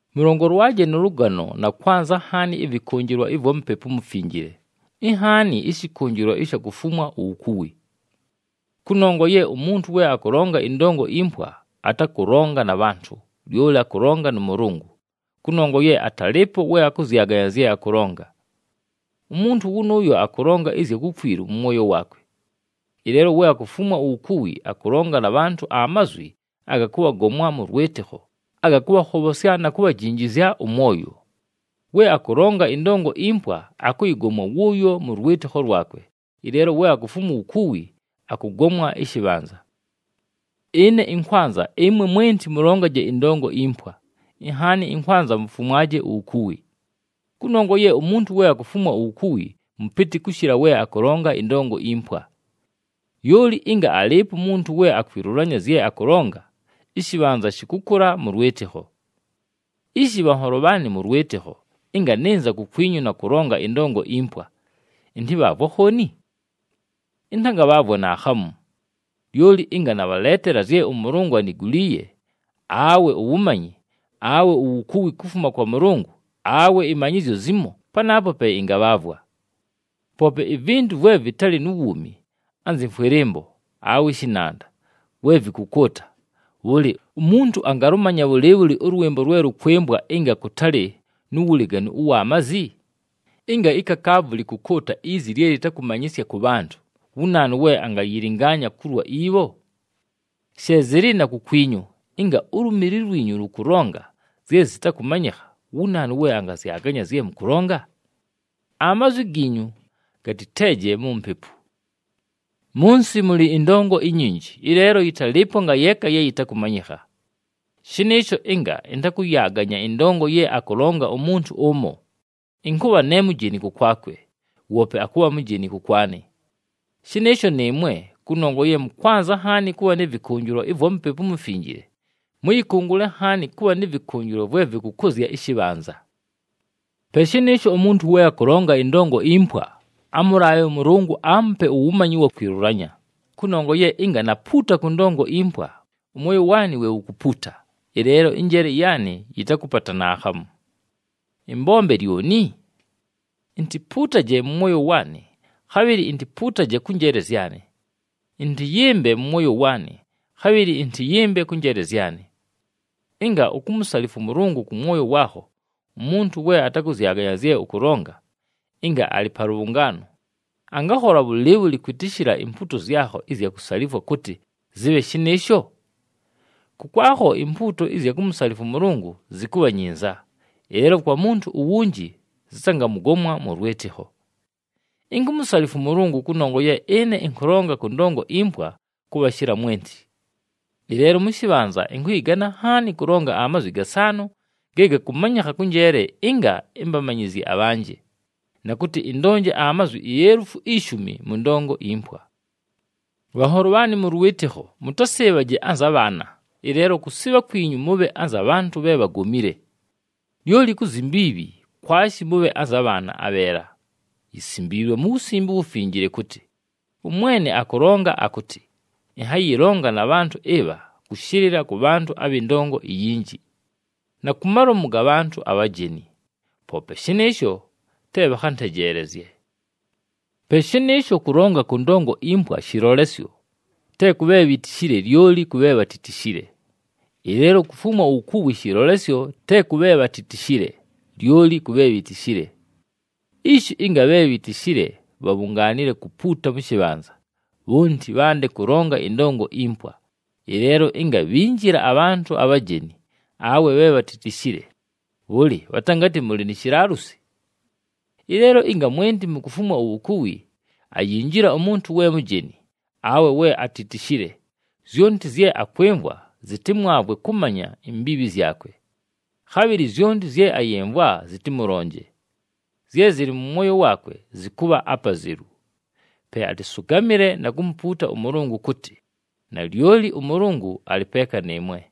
Mʉlongolwaje nʉ lʉgano na kwanza nhaani ɨvɨkʉnjɨlwa ɨvwa Mupepu uMufinjile, inhaani ɨshɨkʉnjɨlwa ɨsha kufumwa uwukuwi. Kʉnongwa ye umuntu we akʉlonga ɨndongo impwa, atakʉlonga na bhantʉ, lyoli akʉlonga nʉ Mʉlʉngʉ, kʉnongwa ye atalɨɨpo we akʉzyaganya zye akʉlonga. Umuntu wʉnʉʉyo akʉlonga ɨzya kukwilu mʉ mwoyo waakwe. Ɨleelo we akufumwa uwukuwi, akʉlonga na bhantʉ amazwi aga kʉbhagomwa mʉ lwɨtɨkho, aga kʉbhakhobhosya na kubhajinjizya ʉmwoyo. We akʉlonga ɨndongo impwa, akʉyɨgomwa wʉʉyo mʉ lwɨtɨkho lwakwe, ɨleelo we akufumwa uwukuwi akʉgomwa ɨshɨbhanza. Ɨne ɨnkwanza ɨmwe mwenti mʉlongaje ɨndongo impwa, inhaani ɨnkwanza mufumwaje uwukuwi. Kʉnongwa ye umuntu we akufumwa uwukuwi mʉpɨtɨ kʉshɨla we akʉlonga ɨndongo impwa. Lyoli ɨnga alɨɨpo umuntu we akwilulanya zye akʉlonga, ɨshɨbhanza shɨkʉkʉla mʉ lwɨtɨkho. Ishi bhanholo bhaanɨ mʉ lwɨtɨkho, ɨnga nɨnza kukwinyu na kʉlonga ɨndongo impwa, ɨntɨbhaavwe akhooni? Ɨntangabhaavwa naakhamu. Lyoli ɨnga nabhaleetela zye ʉMʉlʉngʉ aniguliiye, awe uwumanyi, awe uwukuwi kufuma kwa Mʉlʉngʉ, awe ɨmanyɨzyo zimo panaapo pe ɨngabhaavwa. Poope ivintu vwe vɨtalɨ nu wuumi, anzɨ mfwɨlɨmbo, awe ɨshɨnanda, we vɨkʉkʉʉta, bhʉlɨ, umuntu angalʉmanya bhʉlɨɨbhʉlɨ ʉlwɨmbo lwe lʉkwɨmbwa ɨnga kʉtalɨ nu wuleganu ʉwa mazi? Ɨnga ikakaavu lɨkʉkʉʉta izi lye lɨtakʉmanyɨsya kʉ bhantʉ, wu naanu we angayɨlɨngaanya kulwa ibho? She zɨlɨ na kukwinyu, ɨnga ulumili lwinyu lʉkʉlonga zye zɨtakʉmanyɨkha, wu naanu we angazyaganya zye mʉkʉlonga? Amazwi giinyu gatɨteeje mu mpepu. Mʉ nsɨ mʉlɨ ɨndongo inyinji, ɨleelo yɨtalɨɨpo ngayeeka ye yɨtakʉmanyɨkha. Shɨnɨɨsho ɨnga ɨntakʉyaaganya ɨndongo ye akʉlonga umuntu ʉmo, ɨnkʉbha ne mujeni kʉkwakwe, woope akʉbha mujeni kʉkwanɨ. Shɨnɨɨsho nɨɨmwe, kʉnongwa ye mʉkwanza nhaani kʉbha nɨ vɨkʉnjɨlwa ɨvwa Mupepu uMufinjile, mʉyɨkʉngʉle nhaani kʉbha nɨ vɨkʉnjɨlwa vwe vɨkʉkʉzya ɨshɨbhanza. Pe shɨnɨɨsho, umuntu we akʉlonga ɨndongo impwa, amʉlaabhe ʉMʉlʉngʉ aamupe uwumanyi ʉwa kwilulanya. Kʉnongwa ye ɨnga napuuta kʉ ndongo impwa, ʉmwoyo waanɨ we wukupuuta, ɨleelo ɨnjeele yaanɨ yɨtakʉpata naakhamu. Ɨmbombe lyoni? Intipuutaje mʉ mwoyo waanɨ, khabhɨlɨ intipuutaje kʉ njeele zyanɨ. Ɨntɨyɨmbe mʉ mwoyo waanɨ khabhɨlɨ ɨntɨyɨmbe kʉ njeele zyanɨ. Ɨnga ukumusalifwa ʉMʉlʉngʉ kʉ mwoyo waakho, umuntu we atakʉzyaganya zye ʉkʉlonga, ɨnga alɨ pa lʉbhʉngaano, angakhola bhʉlɨɨbhʉlɨ kwɨtɨshɨla impuuto zyakho ɨzya kusalifwa kʉtɨ, “Zɨbhe shɨnɨɨsho”? Kʉkwakho impuuto ɨzya kumusalifwa ʉMʉlʉngʉ zɨkʉbha nyinza, ɨleelo kwa muntu uwunji zɨtangamʉgomwa mʉ lwɨtɨkho. Inkumusalifwa ʉMʉlʉngʉ kʉnongwa ye ɨne ɨnkʉlonga kʉ ndongo impwa kʉbhashɨla mwenti. Ɨleelo mʉ shɨbhanza ɨnkʉyɨgana nhaani kʉlonga amazwi gasaanʉ ge gakʉmanyɨkha kʉ njeele ɨnga ɨmbamanyɨzye abhanjɨ, na kʉtɨ ɨndonje amazwi ielufu ishumi mʉ ndongo impwa. Bhanholo bhaanɨ mʉ lwɨtɨkho, mʉtasɨɨbhaje anza bhaana, ɨleelo kʉsɨɨbha kwinyu mʉbhe anza bhantʉ bhe bhagomile. Lyoli ku zyi mbiibhi, kwashi mʉbhe anza bhaana abheela. Yisimbiilwe mu Wusimbe uWufinjile kʉtɨ, “ɄMwene akʉlonga akʉtɨ, ‘Ɨnhayɨlonga na bhantʉ ɨbha kʉshɨlɨla kʉ bhantʉ abhɨ ndongo iyinji, na ku malomu ga bhantʉ abhajeni, poope shɨnɨɨsho te bhakhantejeelezye.’” Pe shɨnɨɨsho, kʉlonga kʉ ndongo impwa shɨlolesyo, te kʉ bhe bhitishile lyoli kʉ bhe bhatitishile. Ɨleelo kufumwa uwukuwi shɨlolesyo te kʉ bhe bhatitishile, lyoli kʉ bhe bhitishile. Ishi ɨnga bhe bhitishile bhabhungaanile kupuuta mʉ shɨbhanza, bhonti bhande kʉlonga ɨndongo impwa, ɨleelo ɨnga bhinjila abhantʉ abhajeni, awe bhe bhatitishile, bhʉlɨ bhatangatɨ mʉlɨ ni shilaalusi? Ɨleelo ɨnga mwenti mukufumwa uwukuwi, ayinjila umuntu we mujeni, awe we atitishile, zyonti zye akwɨmvwa zɨtɨmwavwe kʉmanya imbiibhi zyakwe. Khabhɨlɨ zyonti zye ayɨmvwa zɨtɨmʉlonje. Zye zɨlɨ mʉ mwoyo waakwe, zɨkʉbha apazelu. Pe atɨsʉgamɨle na kumupuuta ʉMʉlʉngʉ kʉtɨ, “Nalyoli ʉMʉlʉngʉ alɨ peeka nɨɨmwe!”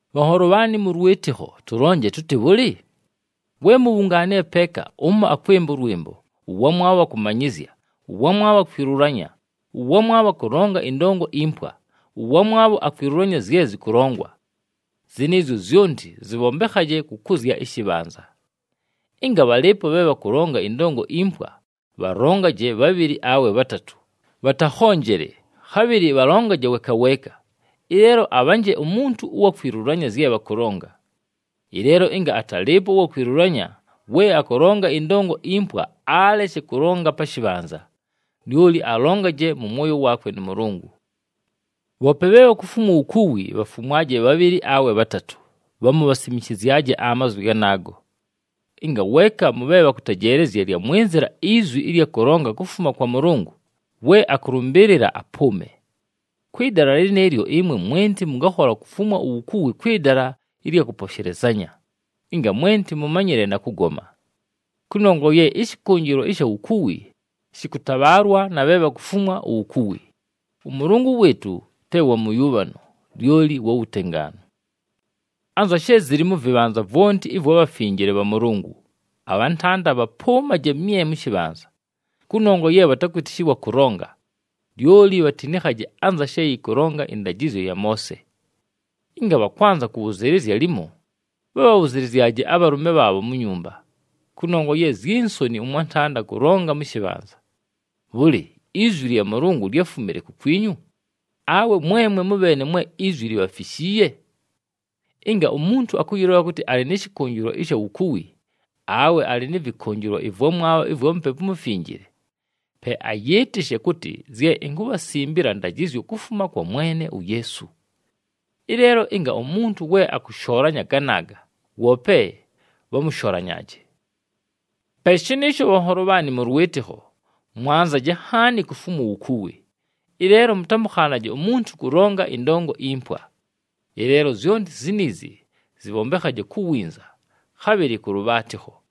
Bhanholo bhaanɨ mʉ lwɨtɨkho, tʉlonje tʉtɨ bhʉlɨ? We mubhungaanile peeka, ʉmo akwɨmba ʉlwɨmbo, ʉwamwabho akʉmanyɨzya, ʉwamwabho akwilulanya, ʉwamwabho akʉlonga ɨndongo impwa, ʉwamwabho akwilulanya zye zɨkʉlongwa. Zɨnɨɨzyo zyonti zɨbhombekhaje kʉkʉzya ɨshɨbhanza. Ɨnga bhalɨɨpo bhe bhakʉlonga ɨndongo impwa, bhalongaje bhabhɨlɨ awe bhatatʉ, bhatakhonjele, khabhɨlɨ bhalongaje weeka weeka, ɨleelo abhanje umuntu ʉwa kwilulanya zye bhakʉlonga. Ɨleelo ɨnga atalɨɨpo ʉwa kwilulanya, we akʉlonga ɨndongo impwa aleshe kʉlonga pa shɨbhanza, lyoli alongaje mʉ mwoyo waakwe nʉ Mʉlʉngʉ. Bhoope bhe bhakufumwa uwukuwi, bhafumwaje bhabhɨlɨ awe bhatatʉ, bhamu bhasimishizyaje amazwi ganaago. Ɨnga weeka mʉ bhe bhakʉtejeelezya lyamwɨnzɨla izwi ɨlya kʉlonga kufuma kwa Mʉlʉngʉ, we akʉlʉmbɨɨlɨla apʉʉme. Kwɨ dala lɨnɨɨlyo ɨmwe mwenti mʉngakhola kufumwa uwukuwi kwɨ dala ɨlya kʉposhelezanya, ɨnga mwenti mʉmanyɨle na kʉgoma. Kʉnongwa ye ɨshɨkʉnjɨlwa ɨsha wukuwi, shɨkʉtabhaalwa na bhe bhakufumwa uwukuwi. ɄMʉlʉngʉ wɨɨtʉ te wa mʉyʉbhano, lyoli wa wutengaanu. Anza she zɨlɨ mʉ vɨbhanza vwonti ɨvwa bhafinjile bha Mʉlʉngʉ, abhantanda bhapʉʉmaje mye mʉ shɨbhanza. Kʉnongwa ye bhatakwɨtɨshɨlwa kʉlonga, lyoli bhatinikhaje anza she yɨkʉlonga ɨndajɨzyo ya Moose. Ɨnga bhakwanza kʉbhʉzɨɨlɨzya limo, bhabhabhʉzɨlɨzyaje abhalʉme bhaabho mu nyumba, kʉnongwa ye zyi nsoni ʉmwantanda kʉlonga mʉ shɨbhanza. Bhʉlɨ, izwi lya Mʉlʉngʉ lyáfumile kukwinyu, awe mwemwe mʉbheene mwe izwi libhafishiiye? Ɨnga umuntu akʉyɨlola kʉtɨ alɨ nɨ shɨkʉnjɨlwa ɨsha wukuwi, awe alɨ nɨ vɨkʉnjɨlwa ɨvwamwabho ɨvwa Mupepu uMufinjile, pe ayɨɨtɨshe kʉtɨ zye inkubhasimbila ndajɨzyo kufuma kwa Mwene uYeesu. Ɨleelo ɨnga umuntu we akʉshoolanya ganaaga, woope bhamʉsholanyaaje. Pe shɨnɨɨsho bhanholo bhaanɨ mʉ lwɨtɨkho, mwanzaje nhaani kufumwa uwukuwi, ɨleelo mʉtamʉkhaanaje umuntu kʉlonga ɨndongo impwa. Ɨleelo zyonti ziniizi zɨbhombekhaje ku winza, khabhɨlɨ kʉ lʉbhaatɨkho.